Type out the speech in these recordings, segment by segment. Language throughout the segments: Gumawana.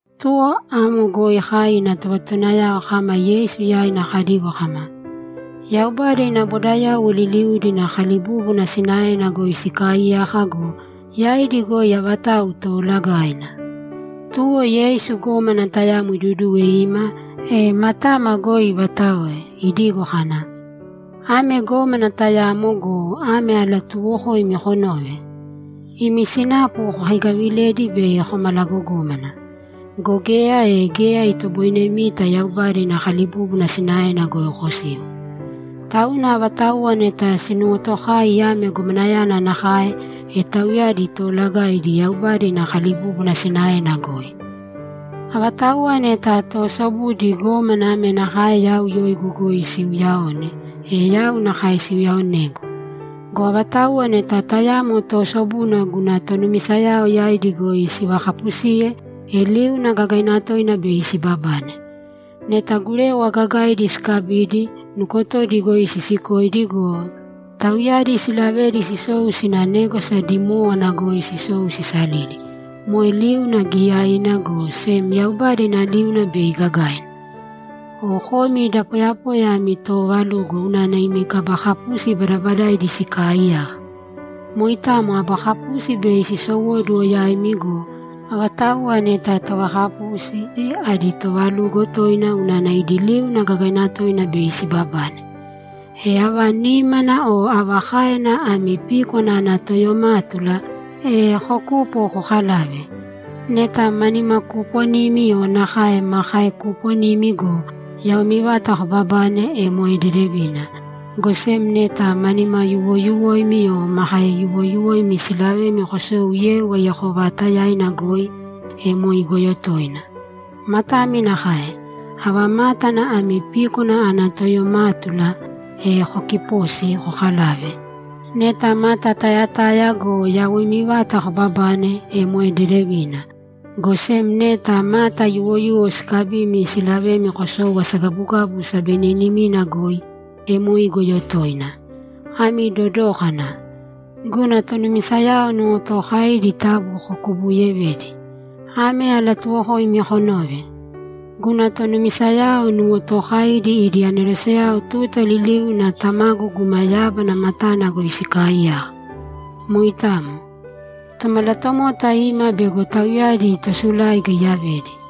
Tuta amo goi kai ina tovatotowanayao kama Yeisu yaina kadigo kama, ‘Yaubada ina bodayauwo liliudi ina kalibúbuna sinaena goi sikaaiyaka go, yaidi goi avatau toolagaina?’ Tuwo Yeisu gómana tayamo iduduwe ima, e matama goi ivataoe, idigo kana, ‘Ame gómana tayamo go, ame alatuuwokoimi konōve: Imi sinapu kokaigavilēdi bei komalagogómana. Go geya, e geya itoboinemita Yaubada ina kalibúbuna sinaena goi kosiu. Tauna avatauwa neta sinuwotokai ame gomanayana nakae, e tauyadi toolagaidi Yaubada ina kalibúbuna sinaena goi. Avatauwa neta toosobudi gómana ame nakae yau yoigu goi siiuyaone, e yau nakae siuyaaonegu. Go avatauwa neta tayamo toosobuna guna tonumisayao yaidi goi sivakapusiye, e liuna gagaina toina bei sibabane. Neta gurewa gagaidi sikabidi, nukotodi goi sisikoidi go, tauyadi silavedi sisou sina négwasa dimówana goi sisou sisalili, moe liuna giiyaina, go sem Yaubada ina liuna bei gagaina. O komi da poyapoya ami toovalugo unana imi kaba kapusi badabadaidi sikaaiyaka. Moitamo aba kapusi bei sisowóduwo yaimi go, avatauwa neta tovakapusi, adi toovalugo toina unana idi liuna gagaina toina bei sibabane! E, ava nímana o ava káena ami píkwana ana toyomátula, e kokūpo kokalāve. Neta ma nimakuuponimi o nakae ma kaekuuponimi go, yawoimi vata kobabane, e moe dedevina, go sem neta ma nimayuwoyuwoimi o ma kaeyuwoyuwoimi silavemi kosou yeu aiyako vaatayaina goi, e moe igoyo toina. Matami nakae. Ava mátana ami píkwana ana toyomátula, e kokipōsi kokalāve. Neta mata tayataya go, yawoimi vata kobabane, e moe dedevina, go sem neta mata yuwoyuwo sikabimi silavemi kosou asagabugabu sabeninimina goi, e moe igoyo toina. Ami dodōkana. Guna tonumisayao nuwotookaidi taabu kokubuuyevēdi. Ame alatuuwokoimi konōve: Guna tonumisayao nuwotookaidi idi aneroseyao tuta liliuna Tamagu guma yábana matana goi sikaaiyaka. [ Moitamo. Tomalatomota ima bego tauyadi tosuláiga iyavedi.]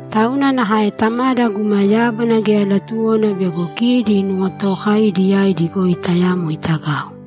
Tauna nakae Tamada guma yábana geya latuwona bego kidi nuwotokaidiyadi yaidi goi tayamo itagau.’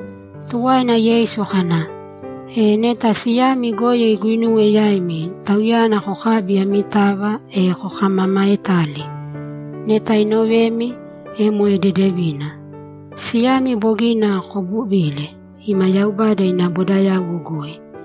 Tuwaina Yeisu kana, ‘E, neta siyami goyo iguinuwe yaimi, tauyana kokābi amitava, e kokamamaetāli. Neta inovemi, e moe dedevina. Siyami bogina kobuvile ima Yaubada ina bodayauwo goi.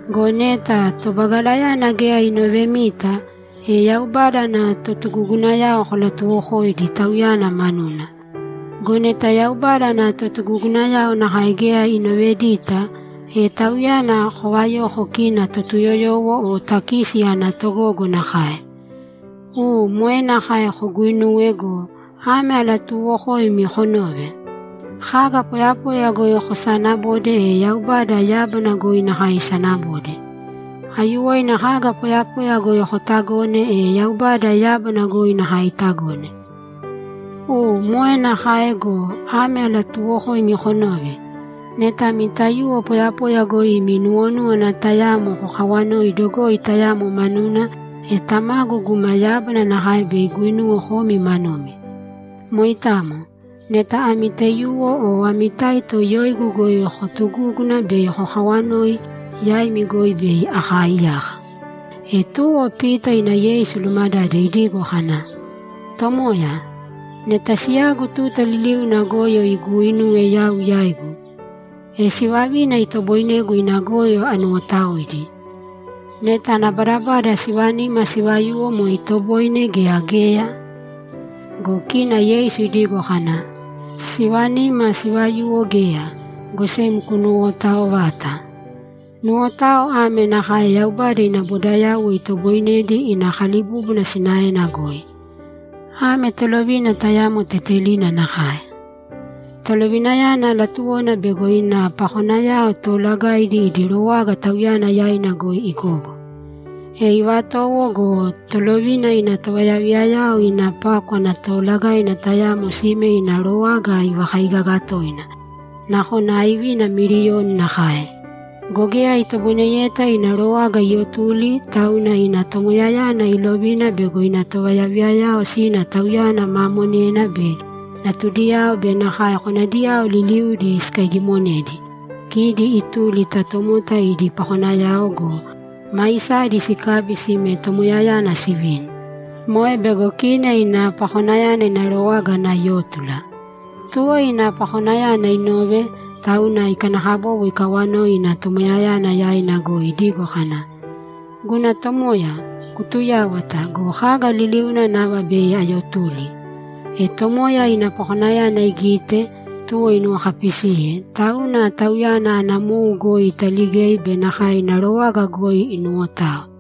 Go neta tobagalayana geya inovemita, e Yaubada ana totugugunayao kolatuwokōidi tauyana manuna. Go neta Yaubada ana totugugunayao nakae geya inovedita, e tauyana kovayōko kina Totuyoyowo o takisi ana togogo nakae. U, moe nakae koguinūwe go, ame alatuuwokoimi konōve: Kaga poyapoya goi kosanabode, e Yaubada yábana goi nakae isanabode. Aiyuwoina kaga poyapoya goi kotagone, e Yaubada yábana goi nakae itagone. U, moe nakae go, ame alatuuwokoimi konōve: Neta ami taiyuwo poyapoya goi imi nuwonúwana tayamo kokawanoi dogoi tayamo manuna, e Tamagu guma yábana nakae bei iguinuwe komi manumi. Moitamo. Neta ami taiyuwo o ami taito yoigu goi kootugúguna bei kokaawanoi, yaimi goi bei akaaiyaka.’ E tuwo Pita ima Yeisu ilumadade idigo kana, ‘Tomoya, neta siyagu tuta liliuna goyo iguuinuwe yau yaigu, e sivavina itoboinegu ina goyo anuwotaoidi? Neta ana badabada sivanima sivayuwo moe itoboine gea geya?’ Go kina Yeisu idigo kana, ‘Sivanima sivayuwo geya, go sem kunuwotaovāta. Nuwotao ame nakae Yaubada ina bodayauwo itoboinedi ina kalibúbuna sinaena goi. Ame tolovina tayamo tetelina nakae. Tolovinayana latuwona bego ina pakonayao toolagaidi idi rowaga tauyana yaina goi igogo. E ivatowo go, tolovina ina tovayaviyayao ina pákwana toolagaina tayamo sime ina rowaga ivakaigaga toina, nakona aivina miliyoni nakae. Go geya itoboineyeta ina rowaga iyotuli, tauna ina tomoyayana ilovina bego ina tovayaviyayao sina tauyana ma monena be natudiyao be nakae konadiyao liliudi sikaigimonedi, kidi ituli ta tomota idi pakonayao go, maisadi sikabi sime tomoyayana sivini. Moe bego kina ina pakonayana ina rowaga ana yótula. Tuwo ina pakonayana inove, tauna ikanakabobo ikawanoi ina tomoyayana yaina goi idigo kana, “Guna tomoya, kutuyāwata go, kaga liliuna nava bei ayotuli!” E tomoya ina pakonayana igite, tuwo inuwokapisiye, tauna tauyana ana mou goi italigei be nakae ina rowaga goi inuwotao.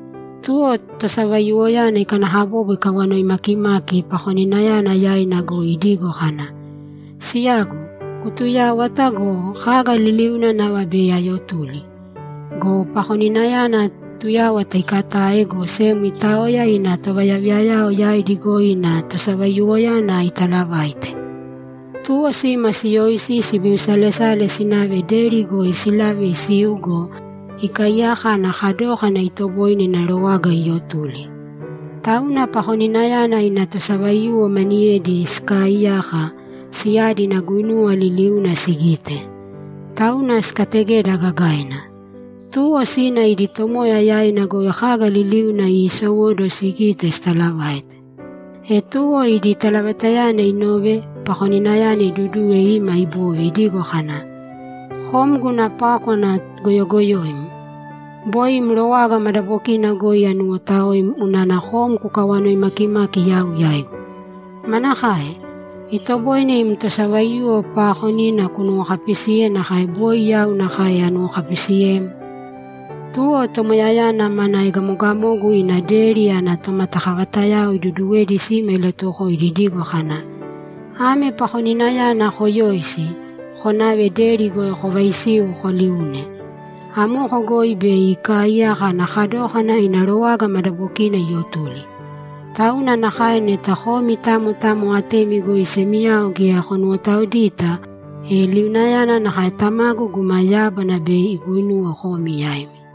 Tuwo tosavaiyuwoyana ikanakabobo ikawanoi makimaki pakoninayana yaina goi idigo kana, “Siyagu, kutuyāwata go, kaga liliuna nava bei ayotuli.” Go pakoninayana tuyáwata ikatae, go sem itaoya ina tovayaviyayao yaidi goi ina tosavaiyuwoyana italavaite. Tuwo sima siyoisi sibiusalesale sinave deri goi silave isiu go, ikaiyaka ana kadókana itoboine ina rowaga iyotuli. Tauna pakoninayana ina tosavaiyuwo maniyedi sikaaiyaka, siyadi ina guinuwa liliuna sigite. Tauna sikategeda gagaina. Tuwo sina idi tomoya yaina goi kaga liliuna iisowóduwo sigite sitalavaite. E tuwo idi talavaitayana inove, pakoninayana iduduwe ima ibove idigo kana, “Kom guna pákwana goyogoyoim! Boi im rowaga madabokina goi anuwotaoim unana kom kukawanoi makimaki yau yaigu. Manakae? Itoboine im tosavaiyuwo paakonina kunuwokapisiye nakae boi yau nakae anuwokapisiyem?” Tuwo tomoyayana mana egamogamogu ina deri ana tomatakavatayao iduduwedi sima ilatuwokoidi idigo kana, “Ame pakoninayana koyōisi, konāve deri goi kovaisīu koliūne. Amoko goi bei ikaaiyaka ana kadókana ina rowaga madabokina iyotuli.” Tauna nakae neta komi tamo tamo atemi goi semiyao geya konuwotaoidita, e liunayana nakae Tamagu guma yábana bei iguinuwe komi yaimi.’